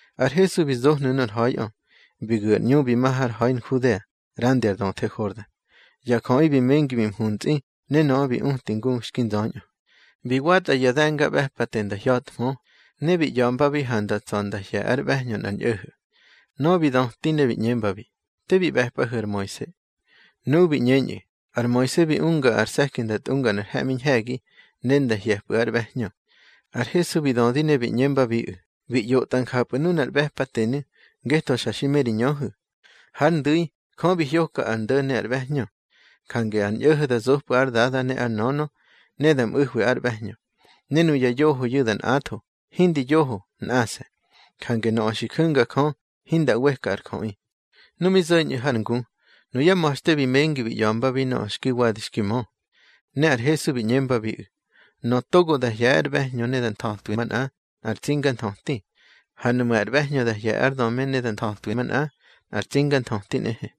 Ar Hesu bi zohnu̱ nor ha̱iꞌö, bi gu̱ ar ꞌñu bi ma har ha̱i Nhudea ꞌrandi ar döthe Hordan. Ya jöꞌi bi mengi bi mhuntsꞌi, ne nöꞌö bi uti ngu xki nzöñꞌö. Bi watꞌa ya de̱ngaꞌbe̱pate nda hya̱thmö, ne bi ꞌya̱mbabi ha nda tsa̱ nda hye̱ ár ꞌbe̱hñö nꞌar ñꞌo̱ho̱. Nöꞌö bi döti ne bi ꞌñembabi: —Te bi ꞌbe̱pꞌahu̱ ar Moise. Nuꞌu̱ bi ꞌñeñꞌu̱: —Ar Moise bi unga ar se̱ki da tꞌunga nꞌar he̱ꞌmi ñhe̱gi, ne nda hye̱pꞌu̱ ár ꞌbe̱hñö. Ar Hesu bi dödi ne bi ꞌñembabiꞌu̱: —Bi ꞌyotꞌa njapꞌu̱ nunar ꞌbe̱patenu̱, ngetho xa xi me ri ñöhu̱. Hár ndu̱i, Jö bi hyoka ar ndo̱ ne ar ꞌbe̱hñö. Jange ar ñꞌo̱ho̱ da zopꞌu̱ ár dada ne ár nönö, ne da mꞌu̱hwi ár ꞌbe̱hñö. Ne nuya yohoyu̱ da nꞌatho. Hindi yoho, nꞌase̱. Jange nöꞌö xi ju̱nga Jö, hinda ꞌweka ar jöꞌi. Nu mi zo̱ñꞌu̱ har ngu, nuyá ma̱xte bi mengi bi ꞌya̱mbabi nöꞌö xki wadi xki mö. Ne ar Hesu bi ꞌñembabiꞌu̱: —Nöꞌö togo da hye̱ ár ꞌbe̱hñö ne da nthötwi manꞌa, nꞌar tsinganthöti. Ha nuꞌmu̱ ar ꞌbe̱hñö da hye̱ ár döme ne da nthötwi manꞌa, nꞌar tsinganthöti nꞌehe.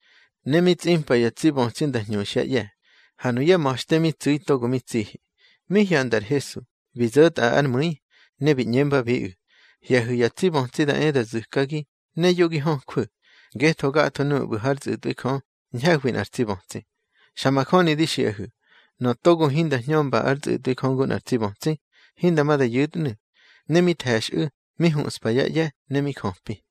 Ne mi tsꞌimpa ya tsi bötsi nda hñuxyá ꞌye̱, ha nuyá ma̱xte mi tsu̱i togo mi tsihi. Mi hyanda ar Hesu, bi zo̱tꞌa ár mu̱i, ne bi ꞌñembabiꞌu̱: —Hye̱hu̱ ya tsi bötsi da e da zu̱kagi, ne yo gi höjwu̱, ngetho gatho nuꞌu̱ ꞌbu̱ hár tsꞌu̱tꞌwi Jö, ñhe̱hwi nꞌar tsi bötsi. Xa majöni di xiꞌahu̱, nöꞌö togo hinda hñömba ár tsꞌu̱tꞌwi Jö ngu nꞌar tsi bötsi, hinda ma da yu̱tnu̱. Ne mi the̱xꞌu̱, mi huꞌspa yá ꞌye̱ ne mi jöpi.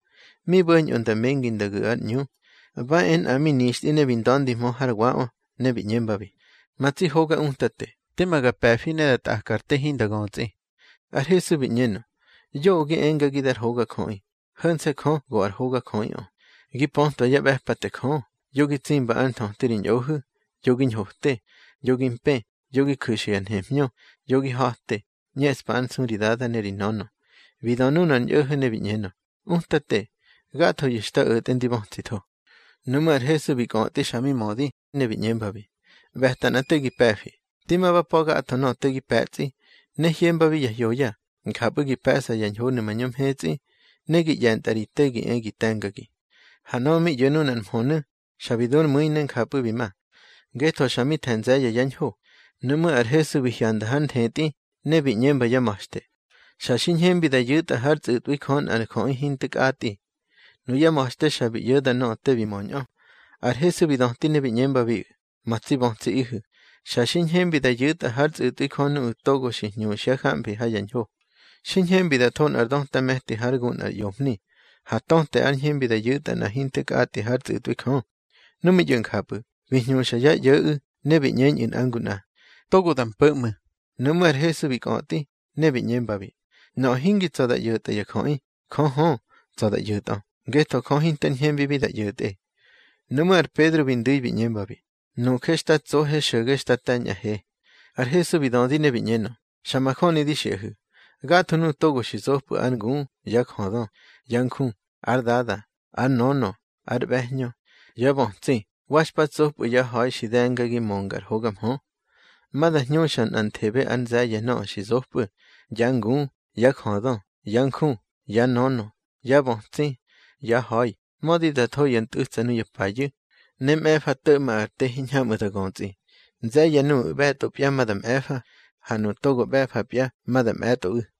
Mi bo̱ñꞌö nda mengi nda gu̱ ar ꞌñu, ba e nꞌa mi nixtꞌi ne bi nda̱ndihmö hár waꞌö, ne bi ꞌñembabi: —Ma tsi hoga Utate, tema ga pe̱fi ne da tꞌaka ar te hinda götsꞌi. Ar Hesu bi ꞌñenö: —Yoꞌö gi engagi dar hogajöꞌi. Ho̱nse̱ Jö go ar hogajöꞌiꞌö. Gi pötwa yá ꞌbe̱pate Jö: Yo gi tsimba ár nthöti ri ñꞌohu̱, yo gi ñhote, yo gi mpë, yo gi ju̱xa ya nhemhñö, yo gi ha̱te, ꞌñeꞌspa ár nsu ri dada ne ri nönö. Bi dö nunar ñꞌo̱ho̱ ne bi ꞌñenö: —Utate, gathoyu̱ xta o̱tꞌe ndi bötsitho. Nuꞌmú̱ ar Hesu bi kꞌötꞌi xa mi mödi, ne bi ꞌñembabi: —ꞌBe̱ta nꞌa te gi pe̱fi: di ma ba pa̱ gatho nöꞌö te gi pe̱tsꞌi, ne hyembabi ya hyoya, njapꞌu̱ gi pe̱ꞌsa ya ñhonu̱ mañö mhetsꞌi. Ne gi ꞌye̱ntꞌa ri te gi e gi te̱ngagi. Ha nöꞌö mi ꞌyo̱ nunar mhönu̱, xa bi du ár mu̱i ne njapꞌu̱ bi ma, ngetho xa mi the̱ nze̱ye̱ yá ñho. Nuꞌmú̱ ar Hesu bi hyanda hár nthetꞌi, ne bi ꞌñemba yá ma̱xte: —Xa xi ñhembi da yu̱tꞌa hár tsꞌu̱tꞌwi Jö nꞌar jöꞌi hinte kꞌatꞌi. Nuyá ma̱xte xa bi ꞌyo̱da nöꞌö te bi möñꞌö. Ar Hesu bi döti ne bi ꞌñembabiꞌu̱: —Ma tsi bötsiꞌihu̱, xa xi ñhembi da yu̱tꞌa hár tsꞌu̱tꞌwi Jö nuꞌu̱ togo xi hñuxyá jamfi ha ya ñho. Xi ñhembi da tho nꞌar döta me̱ti hár gu nꞌar ꞌyomhni, ha töte ár ñhembi da yu̱tꞌa nꞌa hinte kꞌatꞌi hár tsꞌu̱tꞌwi Jö. Nu mi ꞌyo̱ njapꞌu̱, bi hñuxa yá ꞌyo̱ꞌu̱, ne bi ꞌñeñꞌu̱ nꞌa ngu nꞌa: —Togo da mpo̱ ꞌmu̱. Nuꞌmú̱ ar Hesu bi kꞌötꞌi, ne bi ꞌñembabi: —Nöꞌö hingi tsa̱ da ꞌyo̱tꞌa ya jöꞌi, Jö hö, tsa̱ da ꞌyo̱tꞌö, ngetho Jö hinter ñhembibi da ꞌyo̱tꞌe. Nuꞌmú̱ ar Pedro bi ndu̱i bi ꞌñembabi: —Nuje xta tsohe xo̱ge xta te̱ñꞌahe. Ar Hesu bi dödi ne bi ꞌñenö: —Xa majöni di xiꞌahu̱, gatho nuꞌu̱ togo xi zopꞌu̱ ár ngu, yá jödö, yá nju, ár dada, ár nönö, ár ꞌbe̱hñö, yá bötsi, wa xpa tsopꞌu̱ yá ha̱i xi de̱ngagi mönga ar hoga mhö, ma da hñuxa nꞌanthebe ár nze̱ye̱ nöꞌö xi zopꞌu̱: yá ngu, yá jödö, yá nju, yá nönö, yá bötsi, yá ha̱i, mödi da tho ya ntꞌu̱tsa nuya payu̱, ne mꞌe̱fa to̱ꞌma ar te hiñhamꞌu̱ da götsꞌi. Nze̱ye̱ nuꞌu̱ ꞌbe̱tꞌopya ma da mꞌe̱fa, ha nuꞌu̱ togo ꞌbe̱fapya ma da mꞌe̱tꞌoꞌu̱.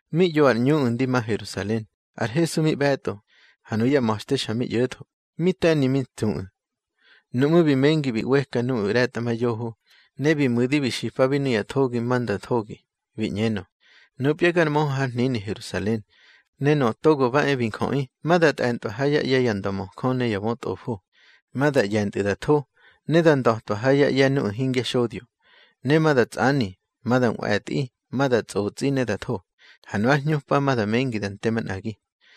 Mi ꞌyo ar ꞌñuꞌu̱ ndi ma Herusalen, ar Hesu mi ꞌbe̱tꞌo, ha nuyá ma̱xte xa mi ꞌyo̱tho, mi te̱ni mi ntsuꞌu̱. Nuꞌmú̱ bi mengi bi ꞌweka nuꞌu̱ ꞌre̱tꞌamayoho, ne bi mu̱di bi xipabi nuya thogi ma nda thogi. Bi ꞌñenö: —Nupya gar möhö har hnini Herusalen, ne Nöꞌö Togo ba e bi Njöꞌi ma da tꞌe̱ntꞌwa ha yá ꞌye̱ ya ndömöjö ne ya bötꞌofo. Ma da ꞌye̱ntꞌu̱ da tho, ne da nda̱twa ha yá ꞌye̱ nuꞌu̱ hingya xodyo. Ne ma da tsꞌani, ma da nꞌwe̱tꞌi, ma da tsꞌotsꞌi ne da tho, ha nu ár hñupa ma da mengi da nte manꞌagi.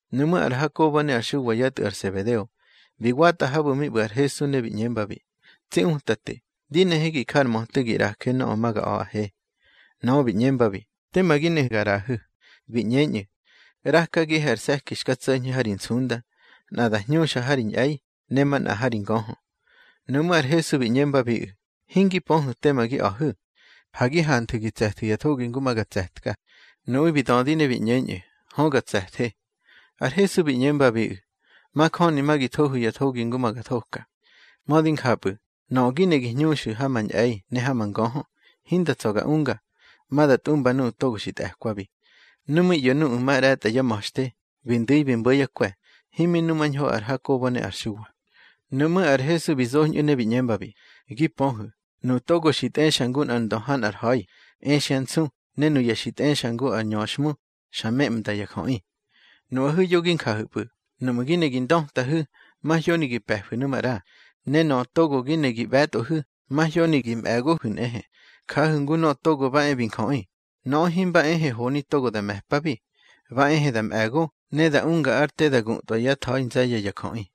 Nuꞌmú̱ ar Hakobo ne ar Xuwa yá tꞌu̱ ar Sebedeo, bi watꞌa habu̱ mi ꞌbu̱ ar Hesu, ne bi ꞌñembabi: —Tsi Utate, di nehe gi ja ar möte gi ꞌraje nöꞌö ma ga a̱ꞌahe. Nöꞌö bi ꞌñembabi: —Tema gi ne ga ꞌraꞌahu̱. Bi ꞌñeñꞌu̱: —ꞌRakagihe ar se̱ki xka tso̱ñhe ha ri nsunda, nꞌa da hñuxa ha ri ñꞌe̱i, ne manꞌa ha ri ngöhö. Nuꞌmú̱ ar Hesu bi ꞌñembabiꞌu̱: —Hingi pöhu̱ tema gi a̱hu̱. Ha gi hanthu̱ gi tse̱thu̱ ya thogi ngu ma ga tse̱tka. Nuꞌu̱ bi dödi ne bi ꞌñeñꞌu̱: —Hö ga tse̱the. Ar Hesu bi ꞌñembabiꞌu̱: —Majöni ma gi thohu̱ ya thogi ngu ma ga thoka. Mödi njapꞌu̱, nöꞌö gi ne gi hñuxu̱ ha ma ñꞌe̱i ne ha ma ngöhö, hinda tsa̱ ga unga. Ma da tꞌumba nuꞌu̱ togo xi tꞌe̱kwabi. Nu mi ꞌyo̱ nuꞌu̱ ma ꞌre̱tꞌa yá ma̱xte, bi ndu̱i bi mbo̱ yá kwe̱, himi numañho ar Hakobo ne ar Xuwa. Nuꞌmú̱ ar Hesu bi zoñꞌu̱ ne bi ꞌñembabi: —Gi pöhu̱, nuꞌu̱ togo xi tꞌexa ngu ar ndö ha nꞌar ha̱i, exyá nsu, ne nuya xi tꞌexa ngu ar ñöxhmu, xa memnda ya jöꞌi. Nuꞌahu̱ yo gi njahu̱pꞌu̱. Nuꞌmu̱ gi ne gi ndötahu̱, mahyoni gi pe̱fu̱ nu maꞌra. Ne nöꞌö togo gi ne gi ꞌbe̱tꞌohu̱, mahyoni gi mꞌe̱gohu̱ nꞌehe. Jahu̱ ngu Nöꞌö Togo ba e bi Njöꞌi. Nöꞌö himba ehe honi togo da me̱pabi, ba ehe da mꞌe̱go, ne da unga ár te da gutꞌwa yá tha̱i nze̱ye̱ ya jöꞌi.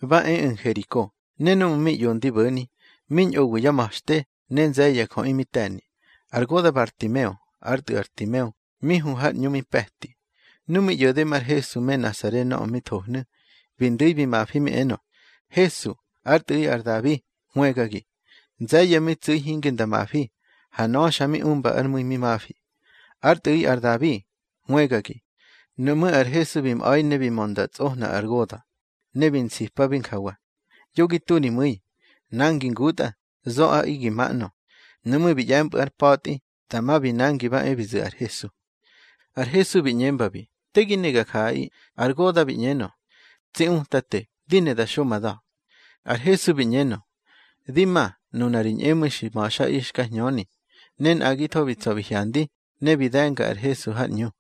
Ba eꞌu̱ Nheriko, ne núꞌmu̱ mi ꞌyo ndi bo̱ni, mi ñꞌowi yá ma̱xte, ne nze̱ye̱ ya jöꞌi mi te̱ni. Ar goda̱ Bartimeo, ár tꞌu̱ ar Timeo, mi hu har ꞌñu mi pe̱ti. Ne mi ꞌyo̱de mar Hesu me Nasare nöꞌö mi thohnu̱, bi ndu̱i bi mafi mi enö: —Hesu, ár tꞌu̱ꞌi ar Dabi, hwëgagi. Nze̱ye̱ mi tsu̱i hinge nda mafi, ha nöꞌö xa mi umbár mu̱i mi mafi: —Ár tꞌu̱ꞌi ar Dabi, hwëgagi. Nuꞌmú̱ ar Hesu bi mꞌa̱i ne bi mö nda tsꞌohna ar goda̱, ne bi nsipabi njawa: —Yo gi tu ri mu̱i. Nangi ngutꞌa, zoꞌaꞌi gi ma ꞌnö. Nuꞌmú̱ bi ꞌye̱mpꞌu̱ ár pa̱tꞌi, dama bi nangi ba e bi zu̱ ar Hesu. Ar Hesu bi ꞌñembabi: —Te gi ne ga jaꞌaꞌi. Ar goda̱ bi ꞌñenö: —Tsi Utate, di ne da xo ma da̱. Ar Hesu bi ꞌñenö: —Di ma, nuna ri ñꞌemu̱i xi ma̱xꞌaꞌi xka hñöni. Ne nꞌagitho bi tsa̱ bi hyandi, ne bi de̱nga ar Hesu har ꞌñu.